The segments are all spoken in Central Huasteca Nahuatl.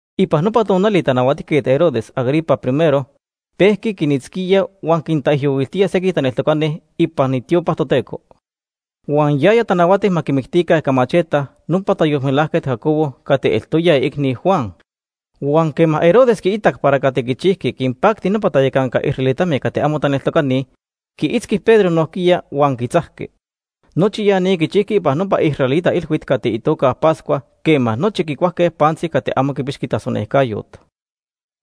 Ipan nopa tonali Tanahuatijquet Herodes Agripa I Iixhui Herodes el Grande. pejqui quinitzquía huan quintaijyohuiltía sequij taneltocani ipan itiopa Toteco. Huan yaya tanahuati ma quimictica ica macheta nopa tayolmelajquet Jacobo cati eltoya iicni Juan. Huan quema Herodes quiitac para cati quichijqui quinpacti nopa tayacanca israelitame cati amo taneltocani, quiitzqui Pedro nojquiya huan quitzajqui. Nochi ya ni quichijqui ipan nopa israelita ilhuit cati itoca Pascua quema nochi quicuajque pantzi cati amo quipixqui tasonejcayot.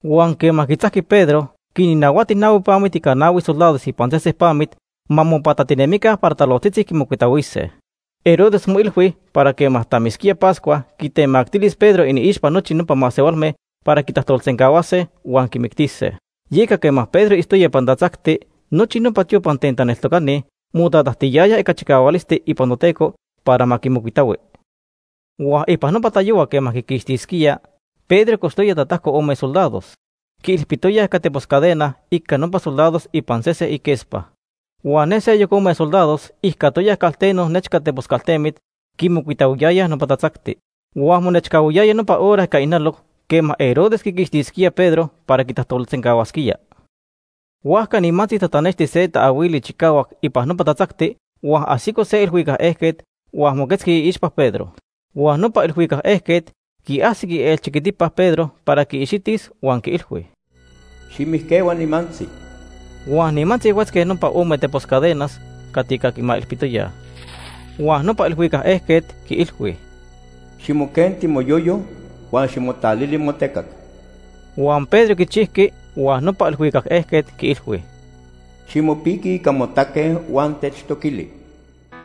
Huan quema quitzajqui Pedro, quinnahuati nahui pamit ica nahui soldados ipan sesen pamit ma quipatatinemica para talojtzitzi quimocuitahuise. Herodes moilhui para quema tamisquía Pascua, quitemactilis Pedro iniixpa nochi nopa masehualme para quitajtolsencahuase huan quimictise. Yeca quema Pedro itztoya ipan tatzacti, nochi nopa tiopa ten taneltocani motatajtiyayaj ica chicahualisti ipan Toteco para ma quimocuitahui. Huan ipan nopa tayohua quema para tonili quiquixtisquía, Pedro cochtoya tatajco ome soldados. Quiilpitoyaj ica tepos cadena ica nopa soldados ipan sesen iquespa. Huan ne seyoc ome soldados ijcatoyaj calteno nechca tepos caltemit, quimocuitahuiyayaj nopa tatzacti. Huan monechcahuiyaya nopa hora ica ijnaloc quema Herodes quiquixtisquía Pedro para quitajtolsencahuasquía. Huajca nimantzi tatanexti se taahuili chicahuac ipan nopa tatzacti huan ajsico se ilhuicac ejquet huan moquetzqui iixpa Pedro. Huan nopa ilhuicac ejquet quiajsic ielchiquitipa Pedro para quiixitis huan quiilhui: “Ximijquehua nimantzi.” Huan nimantzi huetzque nopa ome tepos cadenas cati ica quimailpitoyaj. Huan nopa ilhuicac ejquet quiilhui: “Ximoquenti moyoyo, huan ximotalili motecac.” Huan Pedro quichijqui, huan nopa ilhuicac ejquet quiilhui: “Ximopiqui ica motaque huan techtoquili.”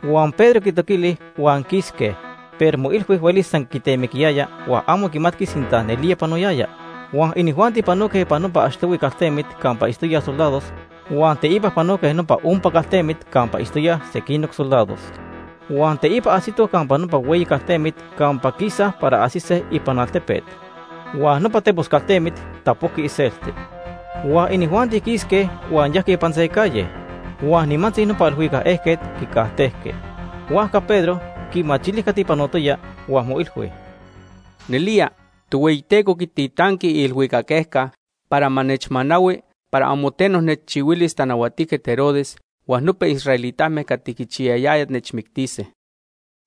Huan Pedro quitoquili huan quisque, pero moilhui huelis san temiquiyaya huan amo quimatqui sinta nelía panoyaya. Huan inijuanti panoque ipan nopa achtohui caltemit campa itztoyaj soldados, huan teipa panoque nopa ompa caltemit campa itztoyaj sequinoc soldados. Huan teipa ajsitoj campa nopa hueyi caltemit campa quisaj para ajsise ipan altepet, huan nopa tepos caltemit tapojqui iselti. Huan inijuanti quisque huan yajque ipan se calle. Huan nimantzi nopa ilhuicac ejquet quicajtejqui. Huajca Pedro quimachili cati panotoya, huan moilhui: “Nelía, Tohueyiteco quititanqui iilhuicac ejca para ma nechmanahui para amo teno nechchihuilis Tanahuatijquet Herodes huan nopa israelitame cati quichiyayayaj nechmictise.”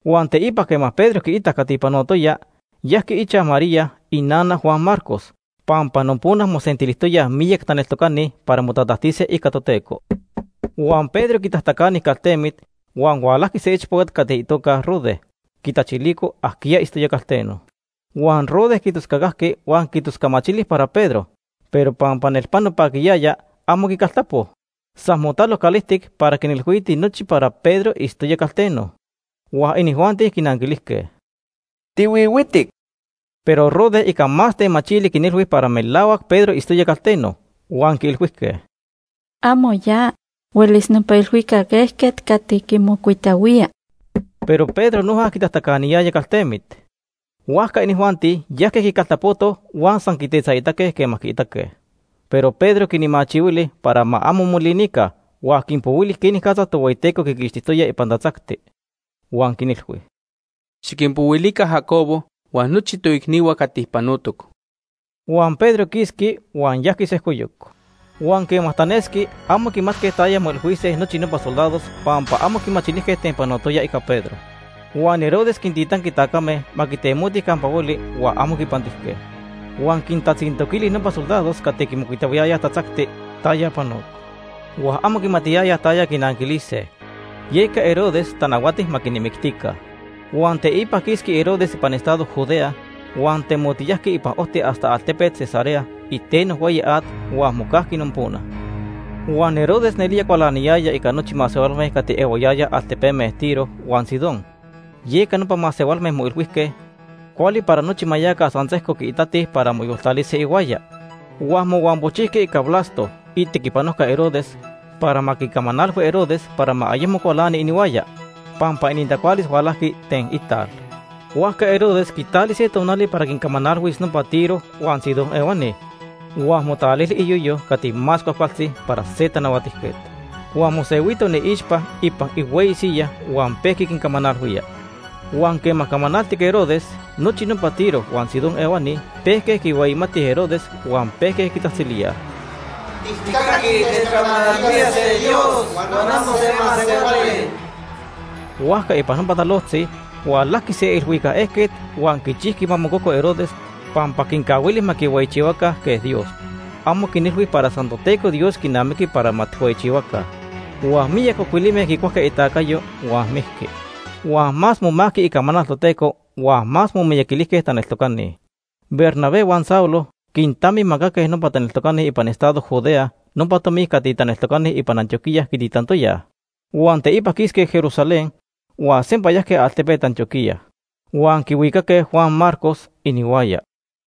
Huan teipa quema Pedro quiitac cati panotoya, yajqui ichaj María, inana Juan Marcos, pampa nopona mosentilijtoyaj miyac taneltocani para motatajtise ica Toteco. Huan Pedro quitajtacani caltemit, huan hualajqui se ichpocat cati itoca Rode quitachilico ajquiya itztoya calteno. Huan nopa Rode quitoscacajqui huan quitoscamachili para Pedro, pero pampa nelpano paquiyaya, amo quicaltapo. San motalo calijtic para quinilhuiti nochi para Pedro itztoya calteno. Huan inijuanti quinanquilijque: ―¡Tihuihuitic! Pero Rode ica más temachili quinilhui para melahuac Pedro itztoya calteno. Huan quiilhuijque: ―Amo ya. Huelis nopa ilhuicac ejquet cati quimocuitahuía. Pero Pedro noja quitajtacaniyaya caltemit. Huajca inijuanti yajque quicaltapotoj huan san quitetzaitaque quema quiitaque. Pero Pedro quinmachihuili para ma amo molinica huan quinpohuili quenicatza Tohueyiteco quiquixtijtoya ipan tatzacti. Huan quinilhui: ―Xiquinpohuilica Jacobo huan nochi toicnihua cati panotoc. Huan Pedro quisqui huan yajqui sejcoyoc. Huan quema tanesqui, amo quimatque taya moilhuise nochi nopa soldados pampa amo quimachilijque ten panotoya ica Pedro. Huan Herodes quintitanqui tacame ma quitemotij campa hueli huan amo quipantijque. Huan quintatzintoquili nopa soldados cati quimocuitahuiyayaj tatzacti taya panoc. Huan amo quimatiyayaj taya quinanquilise, yeca Herodes tanahuati ma quinmictica. Huan teipa quisqui Herodes ipan estado Judea, huan temotiyajqui ipan ojti hasta altepet Cesarea iteno hueyi at huan mocajqui nopona. Huan Herodes nelía cualaniyaya ica nochi masehualme cati ehuayayaj altepeme Tiro huan Sidón, yeca nopa masehualme moilhuijque cuali para nochi ma yaca san sejco quiitatij para moyoltalise ihuaya. Huan mohuampojchijque ica Blasto, itequipanojca Herodes, para ma quicamanalhui Herodes para ma ayecmo cualani inihuaya, pampa inintacualis hualajqui ten ital. Huajca Herodes quitali se tonali para quincamanalhuis nopa Tiro huan Sidón ehuani huan motalili iyoyo cati más cuajcualtzi para se tanahuatijquet. Huan mosehuito iniixpa ipan ihueyi siyaj huan pejqui quincamanalhuía. Huan quema camanaltic Herodes, nochi nopa Tiro huan Sidón ehuani pejque quihueyimatij Herodes huan pejque quitzajtzilíaj: “Tijcaquij techcamanalhuía se dios huan amo se masehuali.” Huajca ipan nopa talojtzi hualajqui se ilhuicac ejquet huan quichijqui ma mococo Herodes pampa quincahuili ma quihueyichihuaca quej Dios. Amo quinilhui para san Toteco Dios quinamiqui para ma tijhueyichihuase. Huan miyac ocuilime quicuajque itacayo huan mijqui. Huan más momajqui icamanal Toteco huan más momiyaquilijque taneltocani. Bernabé huan Saulo quintamimacaque nopa taneltocani ipan estado Judea nopa tomi cati taneltocani ipan Antioquía quititantoyaj. Huan teipa quisque Jerusalén huan sempa yajque altepet Antioquía. Huan quihuicaque Juan Marcos inihuaya.